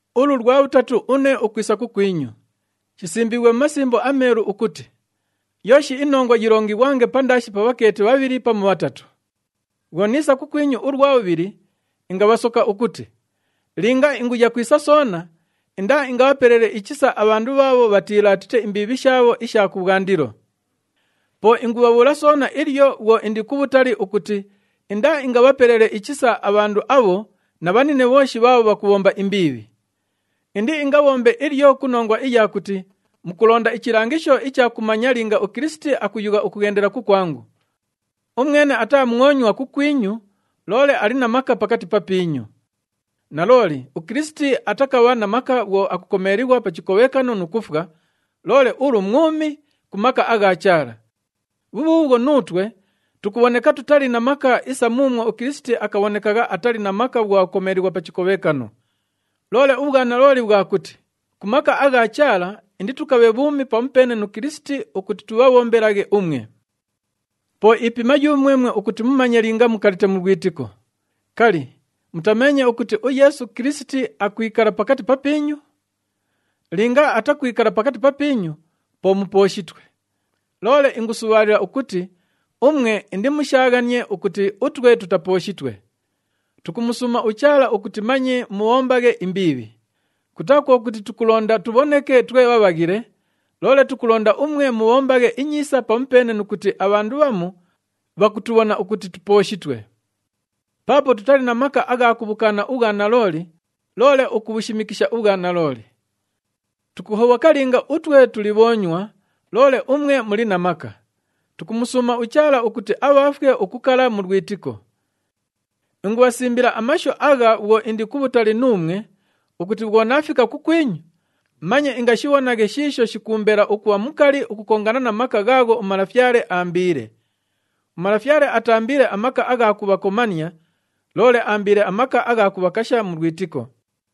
Ulu lwa bhutatu une ukwisa kukwinyu. Shisimbiighwe mu Masimbo aMeelu ukuti, “Yooshi inongwa yilongighwange pandaashi pa bhakeeti bhabhili pamu bhatatu.” Bhwo niisa kukwinyu ulwa bhubhili, ingabhasoka ukuti, linga inguya kwisa soona, indaaingabhapelele ichisa abhandu bhaabho bhatiilaatite imbiibhi shaabho isha kubhwandilo. Po ingubhabhuula soona ilyo bhwo indi kubhutali ukuti indaaingabhapelele ichisa abhandu abho na bhanine bhooshi bhaabho bhakubhomba imbiibhi. Indiingabhombe ilyo ku nongwa iya kuti mukulonda ichilangisho icha kumanya linga uKilisiti akuyugha ukughendela kukwangu. Umwene ataa mwonywa kukwinyu loole ali na maka pakati papiinyu. Nalooli uKilisiti atakabha na maka bhwo akukomeelighwa pa chikobhekano nu kufwa, loole ulu mwumi ku maka agha Chaala. Bhubhuubhwo, nuutwe tukubhoneka tutali na maka isa muumwo uKilisiti akabhonekagha atali na maka bhwo akukomeelighwa pa chikobhekano. Loole ubhwanalooli bhwa kuti ku maka agha Chaala inditukabhe bhuumi pamupeene nu Kilisiti ukuti tubhabhombelaghe umwe. Po ipima yumwemwe ukuti mumanye linga mukalite mu lwitiko. Kali, mutameenye ukuti uYeesu Kilisiti akwikala pakati papiinyu? Linga atakwikala pakati papiinyu, po mupooshitwe. Loole ingusubhaalila ukuti umwe indimushaaghanie ukuti utwe tutapooshitwe. Tukumusuuma uChaala ukuti manye mubhombaghe imbiibhi. Kutaa kwo kuti tukulonda tubhoneke twe bhabhaghile, loole tukulonda umwe mubhombaghe inyiisa pamupeene nu kuti abhandu bhamu bhakutubhona ukuti tupooshitwe. Paapo tutali na maka agha kubhukaana ubhwanalooli, loole ukubhushimikisha ubhwanalooli. Tukuhobhoka linga utwe tuli bhoonywa, loole umwe muli na maka. Tukumusuuma uChaala ukuti abhaafwe ukukala mu lwitiko. Ingubhasimbila amashu agha bhwo indi kubhutali nuumwe ukuti bhwo naafika kukwinyu, manye ingashibhonaghe shiisho shikuumbela ukubha mukali ukukongana na maka ghaagho uMalafyale aambiile. UMalafyale ataambiile amaka agha kubhakomania, loole aambiile amaka agha kubhakasha mu lwitiko.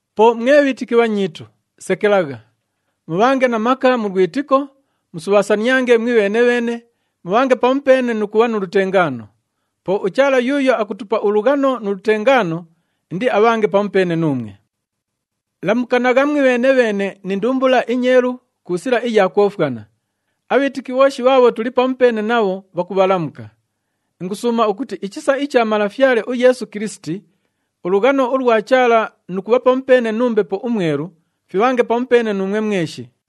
Po mwe bhiitiki bhanyiitu, sekelagha. Mubhange na maka mu lwitiko, musubhaasaniange mwibheene-bheene, mubhange pamupeene nu kubha nu lutengaano. Po uChaala yuuyo akutupa ulughano nu lutengaano indiabhange pamupeene nuumwe. Lamukanagha mwibheene-bheene ni ndumbula inyeelu ku sila iya kwofwana. Abhiitiki bhooshi bhaabho tuli pamupeene nabho, bhakubhalamuka. Ingusuuma ukuti ichisa icha Malafyale uYeesu Kilisiti, ulughano ulwa Chaala nu kubha pamupeene nu Mbepo uMwelu fibhange pamupeene nuumwe mweshi.